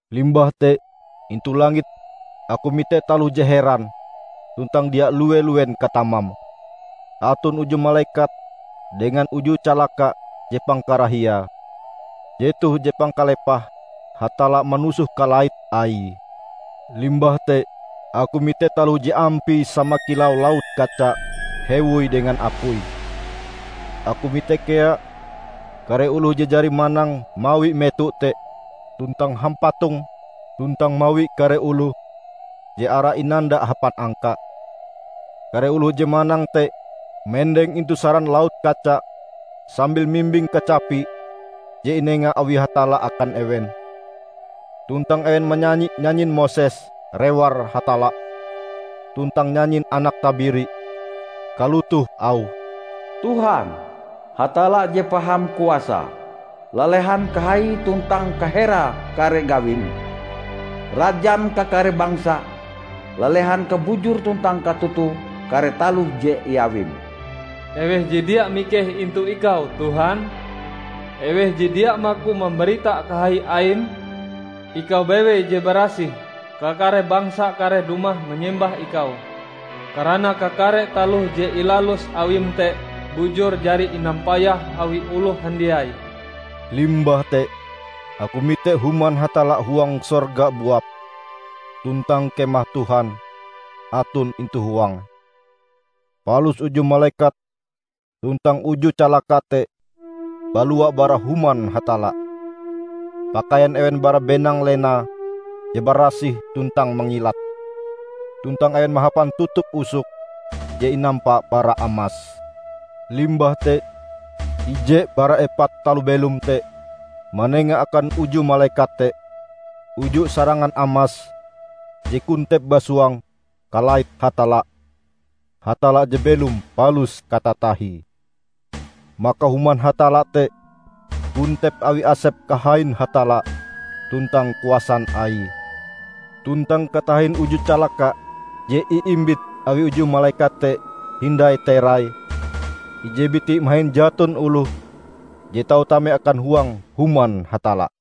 Limbah te intu langit aku mite taloh je heran tuntang dia lue-luen katamame. Aton uju malekat dengan uju calaka je pangkarahiae. Jetoh je pangkalepahe Hatalla manusoh kalait Aie. Limbah te aku mite taloh je ampie sama kilau laut kaca hewoi dengan apui. Aku mite kea kare oloh je jari manang mawi meto te tuntang hampatonge, tuntang mawi kare oloh je arae inanda hapan angka. Kare oloh je manang te mendeng intu saran laut kaca sambil mimbing kacapi je inenga awi Hatalla akan ewen. Tuntang ewen manyanyi nyanyin Moses, rewar Hatalla, tuntang nyanyin Anak Tabiri. Kalotoh auhe, "Tuhan, Hatalla je Paham Kuasae, lalehan kahaie tuntang kaherae kare gawim! Rajan kakare bangsa, lalehan kabujur tuntang katotoe kare taloh je iawim! Eweh je dia mikeh intu Ikau, Tuhan? Eweh je dia maku mambarita kahai Aim? Ikau bewei je barasih. Kakare bangsa kareh dumah manyembah Ikau karana kakare taloh je ilalus Awim te bujur jari inampayah awi oloh handiai." Limbah te aku mite Human Hatalla huang sorga buap, tuntang Kemah Tuhan aton intu huange. Palus uju malekat tuntang uju calaka te balua bara Human Hatalla. Pakaian ewen bara benang lena je barasih tuntang mangilat. Tuntang ewen mahapan tutup usok je inampa bara amas. Limbah te ije bara epat taloh belom te, manenga akan uju malekat te, uju sarangan amas je kontep basuang kalait Hatalla, -- Hatalla je belom palus katatahie. Maka human Hatalla te kontep awi asep kahain Hatalla tuntang kuasan Aie. Tuntang katahin uju calaka je iimbit awi uju malekat te hindai terai, ije biti mahin jaton oloh je tau tame akan huang human Hatalla.